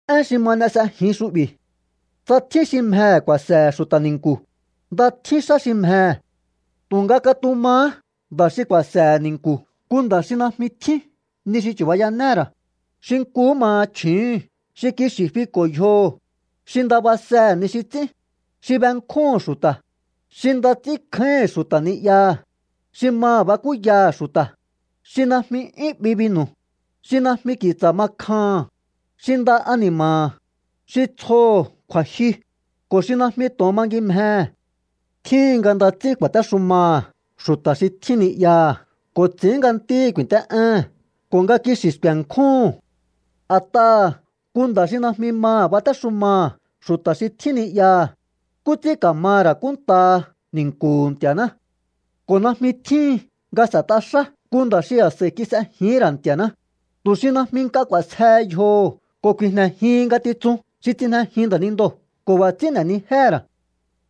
Én xi ma n'e s'ejin xu'bi̱. Tsa tjín xi mjehe̱ ku̱a̱se̱he̱ xu̱ta̱ ni̱nku̱, nda tjín xá xi mjehe̱. Tu̱nga katumahá nda̱ xi ku̱a̱se̱he̱ ni̱nku̱ nku nda̱ xi najmi tjín ni xi chu̱bayanéhe̱ ra̱, xi nkuhú maha chju̱úhu̱n, xi kixi̱ fiko̱ yjoho̱, xi nda basehe̱ ni xi ts'ín, xi benkjúhu̱n xu̱ta̱, xi nda ts'ínkjáíhi̱n xu̱ta̱ ni'yaha̱, xi maha̱ bakúyaha̱ xu̱ta̱, xi najmi 'yún 'bi binu̱, xi najmi ki̱tsa̱ ma kjaha̱n, xi nda ani̱ma̱ha̱, xi tsjoho̱ kju̱a̱jyu, ko̱ xi najmi to̱on mangimjehe̱. Tjíhin nga nda ts'ín ku̱a̱téxumaha̱ xu̱ta̱ xi tjín ni'yaha̱ ko̱ ts'i̱ín nga ntíhi̱ ku̱i̱nt'é'éhe̱n ko̱ nga kixi̱ sku̱e̱nkjúhu̱n. A̱t'aha̱ nku nda̱ xi najmi maha̱ batéxumaha̱ xu̱ta̱ xi tjín ni'yaha̱, ¿nkú ts'ín ka̱maha̱ ra̱ kúnntaha ni̱nku̱hu̱ Nti̱a̱ná? Ko̱ najmi tjíhin nga s'e̱t'a xá nku nda̱ xi a̱s'a̱i kis'ejihín ra̱ Nti̱a̱ná, tu̱ xi najmi nk'a k'u̱a̱sjehe yjoho̱ ko̱ ku̱i̱jne̱jihin ngatitsun xi tsijnejin nda̱nindoo̱ ko̱ b'a̱ ts'ín n'e̱nijéhe̱ ra̱.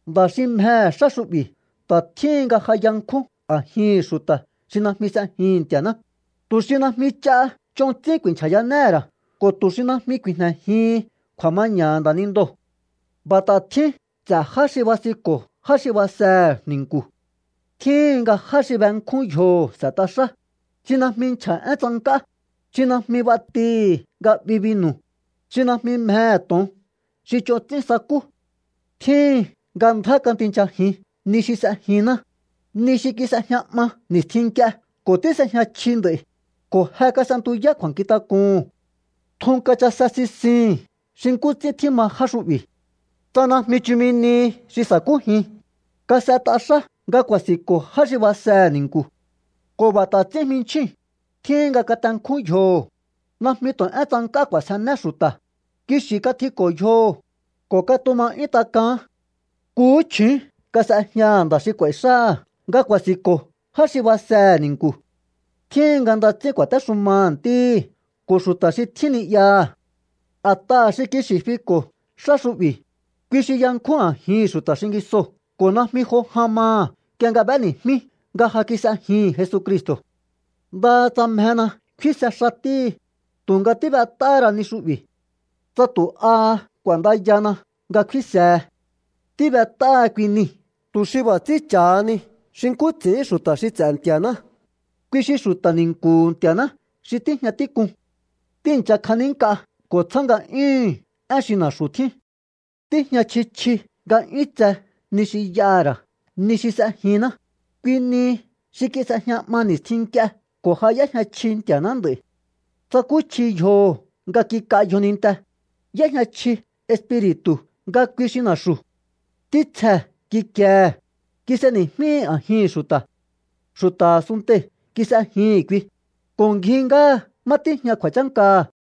Nda̱ xi mjehe̱ xá xu'bi̱ ta̱ tjíhin nga ja yankjún a̱jihi̱n xu̱ta̱ xi najmi s'ejihi̱n Nti̱a̱ná, tu̱ xi najmi ch'a ch'on ts'ín ku̱i̱nchja̱yanéhe̱ ra̱ ko̱ tu̱ xi najmi ku̱i̱jne̱jihin kju̱a̱maña̱ha̱ nda̱nindoo̱. B'a̱ ta̱ tjín ts'e̱ já xi basinko̱ já xi basehe̱ ni̱nku̱. Tjíhin nga já xi benkjún yjoho̱ s'e̱t'a xá, xi najmi nchja̱ én tsank'á, xi najmi b'atihi̱ nga 'bi binu̱, xi najmi mjehe̱ to̱on xi ch'on ts'ín sakú. Tjíhin nga ndjá katinchajin ni xi s'ejinná, ni xi kis'ejña 'ma ni̱stjin nk'ie ko̱ tís'ejña chji nd'a̱i̱, ko̱ je kas'entuyá kju̱a̱nkjintak'uhu̱n. Tjun kachase sisihi̱n xi nkú ts'ín tjíma já xu'bi̱. Tsa najmi chumi nihi xi sa̱kújin, kas'et'a xá nga ku̱a̱si̱nko̱ já xi basehe̱ ni̱nku̱. Ko̱ b'a̱ ta̱ ts'ín jminchjíu̱n, tjíhin nga katenkjún yjoho̱, najmi tu̱ én tsank'á k'u̱a̱sjené xu̱ta̱, kixi̱ katjiko̱ yjoho̱, ko̱ katuma 'yún tak'aán. Nkuhú chju̱ún kas'ejñaha̱ nda̱ xi k'u̱a̱i̱ xáha̱ nga ku̱a̱si̱nko̱ já xi basehe̱ ni̱nku̱. Tjíhin nga nda ts'ín ku̱a̱téxumaha̱ ntíhi̱ ko̱ xu̱ta̱ xi tjín ni'yaha̱. A̱t'aha̱ xi kixi̱ fiko̱ xá xu'bi̱, kui xi yankjún a̱jihi̱n xu̱ta̱ xingisoo̱ ko̱ najmi jo jan maha̱ nk'ie nga b'éni̱jmí nga ja kis'ejihi̱n Jesucristo̱. Ndaha tsa mjena kfínse xatíhi, tu̱nga tíb'et'áhá ra ni xu'bi̱ tsa tu̱ aha k'u̱a̱ndayana nga kfínsehe. Tíb'et'áha kui nii̱ tu̱ xi b'a̱ ts'ín cha̱hani xi nkú ts'i̱ín xu̱ta̱ xi ts'e̱ Nti̱a̱ná, kui xi xu̱ta̱ ni̱nku̱hu̱ Nti̱a̱ná xi tíjña tík'uu̱n. Tíi̱ncha kjanínk'a ko̱ tsjá nga'yúhu̱n én xi na̱xu̱ tjín. Tíjña chji chji nga 'yún tse ni xi y'aha̱ ra̱ ni xi s'ejinná, kui nihi xi kis'ejña 'ma ni̱stjin nk'ie ko̱ ja y'éjña chji Nti̱a̱ná nd'a̱i̱. Tsakúchji yjoho̱ nga kik'a yjoninte, y'éjña chji Espiri̱tu̱ nga kui xi na̱xu̱. Ntítsjee̱ kikiehe̱, kis'eni̱jmíhi̱ a̱jihi̱n xu̱ta̱. Xu̱ta̱ a̱sunntei̱ kis'ejihi̱n kui, ko̱ ngji ngáha má tíjña kju̱a̱chánkaha̱.